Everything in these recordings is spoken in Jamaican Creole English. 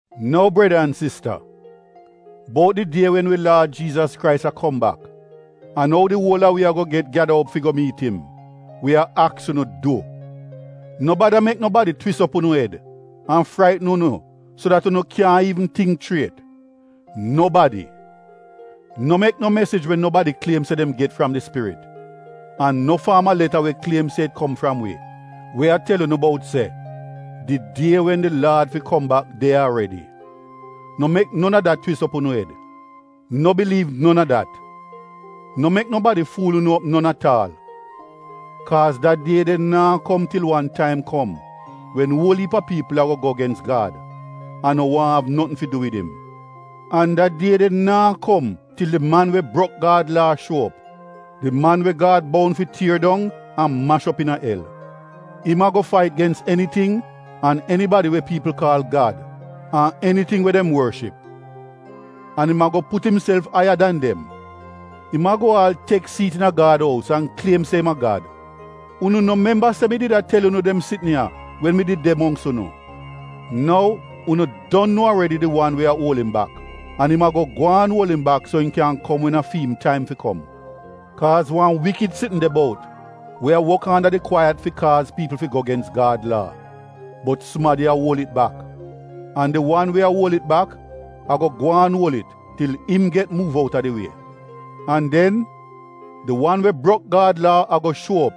Nou breda an sista, bout di die wen wi Laad Jiizas Krais a kom bak, an ou di uol a wi ago get gyada op fi go miit im — wi a aks unu du, no bada mek nobadi twis op unu ed an fraitn unu so dat unu kyaahn iivn tingk chriet. Nobadi! No mek no mesij we nobadi kliem se dem get fram di spirit an no faam a leta we kliem se it kom fram wi we a tel unu bout se: di die wen di Laad fi kom bak de ya aredi, twis op unu ed. No biliiv non a dat! No mek nobadi fuul unu op non at aal. Kaaz da die de naa kom til wan taim kom wen uol iip a piipl ago go gens Gad an no waahn av notn fi du wid im. An da die de naa kom til di Man we brok Gad Laa shuo op — di man we Gad boun fi tier dong an mash op iina el. Im ago fait gens eniting an enibadi we piipl kaal gad, an eniting we dem worship. An im ago put imself aiya dan dem. Im ago aal tek siit iina Gad ous an kliem se im a Gad. Unu no memba se mi did a tel unu dem sitn ya wen mi did de mongks unu? Nou, unu don nuo aredi di wan we a uol im bak, an im ago gwaan uol im bak so im kyan kom wen a fi im taim fi kom. Kaaz wan wikid sitn de bout we a wok anda di kwaiyat fi kaaz piipl fi go gens Gad Laa. Bot sumadi a uol it bak. An di wan we a uol it bak ago gwaan uol it til im get muuv outa di wie. An den, di wan we brok Gad Laa ago shuo op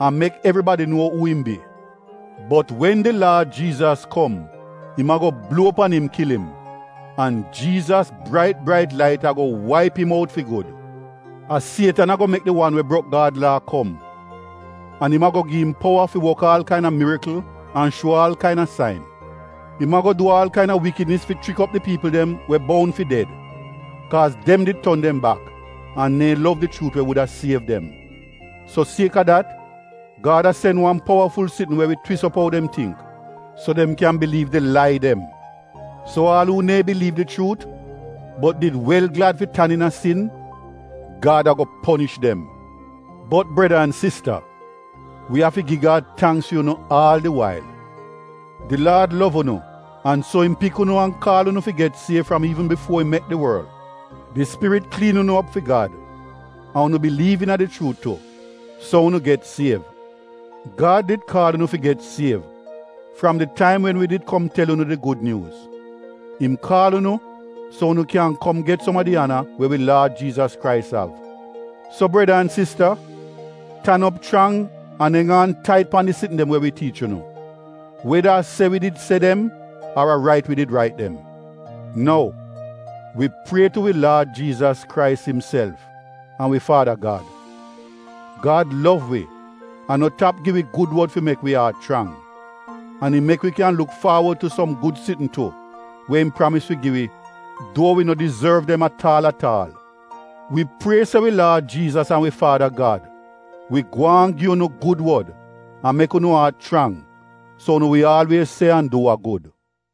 an mek evribadi nuo uu im bi. Bot wen di Laad Jiizas kom im ago bluo pan im kil im, an Jiizas brait brait lait ago waip im out fi gud. A Sietan ago mek di wan we brok Gad Laa kom. An im ago gi im powa fi wok aal kaina mirikl an shuo aal kaina sain. Im ago du aal kaina wikidnis fi chrik op di piipl dem we boun fi ded, kaaz dem did ton dem bak, an neehn lov di chuut we wuda siev dem. So sieka dat, Gad a sen wan powaful sitn we wi twis op ou dem tingk, so dem kyan biliiv di lai dem. So aal a uu neehn biliiv di chuut, bot did wel glad fi tan iina sin, Gad ago ponish dem. Bot breda an sista, wi afi gi Gad tangks fi unu aal di wail. Di Laad lov unu an so im pik unu an kaal unu fi get siev fram iivn bifuo im mek di worl. Di Spirit kliin unu op fi Gad, an unu biliiv iina di chuut tu, so unu get siev. Gad did kaal unu fi get siev fram di taim wen wi did kom tel unu di Gud Nyuuz. Im kaal unu so unu kyan kom get som a di ana we wi Laad Jiizas Krais av. So breda an sista, tan op chrang an eng aan tait pan di sitn dem we wi tiich unu — weda a se wi did se dem ar a rait wi rait did dem. Nou, wi prie tu wi Laad Jiizas Krais imself an wi Faada Gad — Gad lov wi an no tap gi wi gud wod fi mek wi aat chrang, an im mek wi kyan luk faawod tu som gud sitn tu we im pramis fi gi wi duo wi no dizorv dem at aal at aal. Wi prie se wi Laad Jiizas an wi Faada Gad wi gwaan gi unu gud wod an mek unu aat chrang, so unu wi aalwiez se an du wa gud.